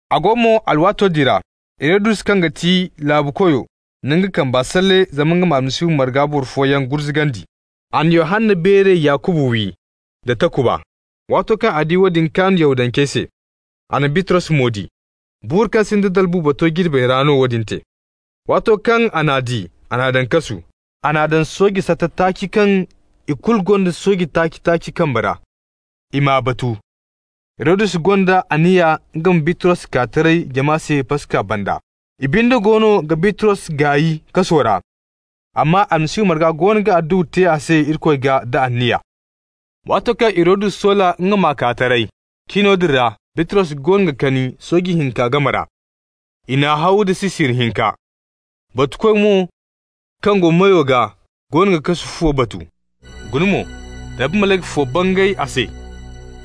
A go mo alwaato din ra, Hirodus kaŋ ga ti laabukoyo na nga kamba salle zama nga ma Almasihu marga boro fooyaŋ gurzugandi. A na Yohanna beere Yakuba wi da takuba. Waato kaŋ a di woodin kaan Yahudancey se, a na Bitros mo di. (Buuru kaŋ sinda dalbu bato jirbey ra no woodin te.) Waato kaŋ a n'a di, a n'a daŋ kasu. A n'a daŋ sooje sata taaci kaŋ ikulu gonda sooje taaci-taaci kambe ra, i m'a batu. Hirodus gonda anniya nga ma Bitros kaa taray jama se Paska banda. I binde goono ga Bitros gaay kaso ra, amma Almasihu marga goono ga adduwa te a se Irikoy gaa da anniya. Waato kaŋ Hirodus soola nga m'a kaa taray, cino din ra Bitros goono ga kani sooje hinka game ra. I n'a haw da sisiri hinka. Batukoy mo kaŋ go meyo gaa goono ga kasu fuwo batu. Guna mo, Rabbi malayka fo bangay a se,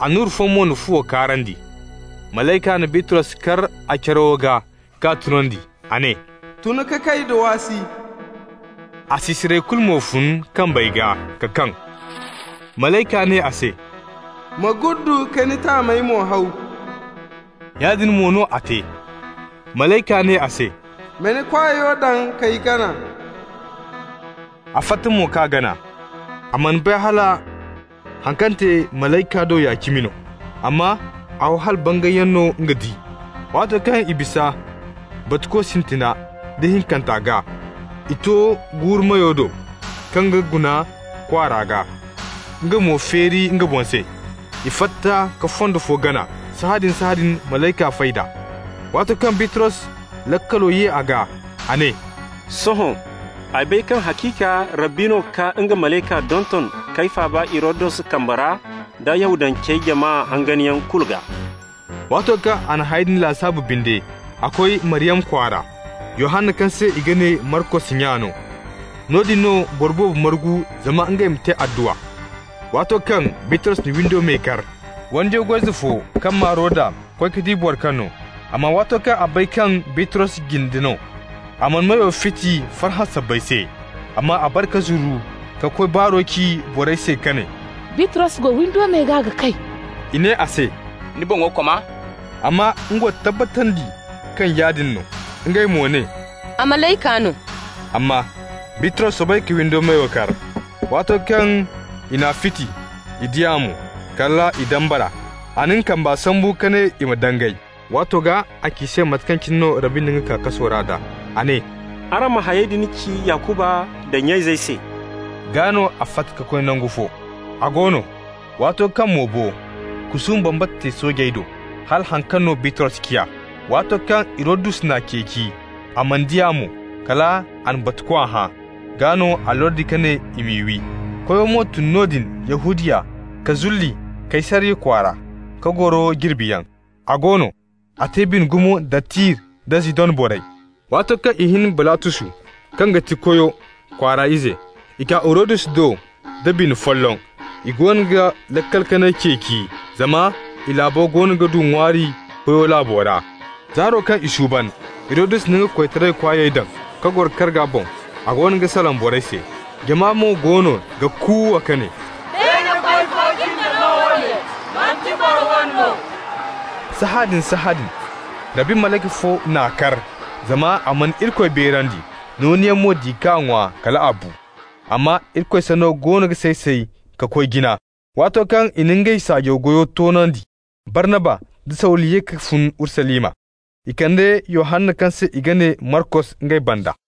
annura fo mo na fuwo kaarandi. Malayka na Bitros kar a carawo gaa k'a tunandi. A ne: «Tun ka kay da waasi.» A sisirey kulu mo fun kambey gaa ka kaŋ. Malayka ne a se: «Ma guddu ka ni taamey mo haw.» Yaadin mo no a te. Malayka ne a se: «Ma ni kwaayo daŋ k'ay gana.» A fatta mo k'a gana. A mana bay hala haŋ kaŋ te malayka do ya cimi no, amma a ho hala bangayyaŋ no nga di. Waato kaŋ i bisa batuko sintina da ihinkanta gaa, i to guuru meyo do kaŋ ga guna kwaara gaa, nga mo feeri nga boŋ se. I fatta ka fondo fo gana. Sahãadin-sahãadin, malayka fay d'a. Waato kaŋ Bitros laakalo ye a gaa, a ne: «Sohõ ay bay kaŋ haciika Rabbi no ka nga malayka donton k'ay faaba Hirodus kambe ra da Yahudancey jama hanganyaŋ kulu gaa.» Waato kaŋ a na hayey din lasaabu binde, a koy Maryama kwaara, Yohanna kaŋ se i ga ne Markos nya no. Noodin no boro boobo margu zama ngey ma te adduwa. Waato kaŋ Bitros na windo me kar, wandiyo goy-ize fo kaŋ maa Roda koy ka di boro kaŋ no. Amma waato kaŋ a bay kaŋ Bitros jinde no, a mana meyo fiti farhã sabbay se, amma a bare ka zuru ka koy baaro ci borey se ka ne: «Bitros go windo me gaa ga kay.» I ne a se: «Ni boŋo koma!» Amma nga wo tabbatandi kaŋ yaadin no. Ngey mo ne: «A malayka no!» Amma Bitros soobay ka windo meyo kar. Waato kaŋ i n'a fiti, i di a mo, kal i dambara. A na nga kamba sambu ka ne i ma dangay. Waato gaa a ci i se mate kaŋ cine no Rabbi na nga kaa kaso ra nd'a. A ne: «Araŋ ma hayey din ci Yakuba da nya-izey se.» Gaa no a fatta ka koy nangu fo. A go no, waato kaŋ mo bo, kusuuma bambata te soojey do, hala haŋ kaŋ no Bitros ciya. Waato kaŋ Hirodus n'a ceeci, a mana di a mo, kal a na batukoy hã. Gaa no a lordi ka ne i m'i wi. Koyo mo tun noodin Yahudiya ka zulli Kaysariya kwaara ka goro jirbiyaŋ. A go no, a te bine gumo da Tir da Zidon borey. Waato kaŋ i hin Balatusu kaŋ ga ti koyo kwaara ize, i kaa Hirodus do da bina folloŋ. I goono ga laakal kanay ceeci, zama i laabo goono ga du ŋwaari koyo laabo ra. Zaaro kaŋ i suuban, Hirodus na nga koytaray kwaayey daŋ ka goro karga boŋ. A goono ga salaŋ borey se. Jama mo goono ga kuuwa ka ne: «Beene koy fo jinde no woone, manti boro wane no!» Sahãadin-sahãadin Rabbi malayka fo n'a kar, zama a mana Irikoy beerandi. Nooniyaŋ mo di k'a ŋwa kal a bu. Amma Irikoy sanno goono ga say-say ka koy jina. Waato kaŋ i na ngey saajaw goyo toonandi, Barnaba da Sawulu ye ka fun Urusalima. I kande Yohanna kaŋ se i ga ne Markos ngey banda.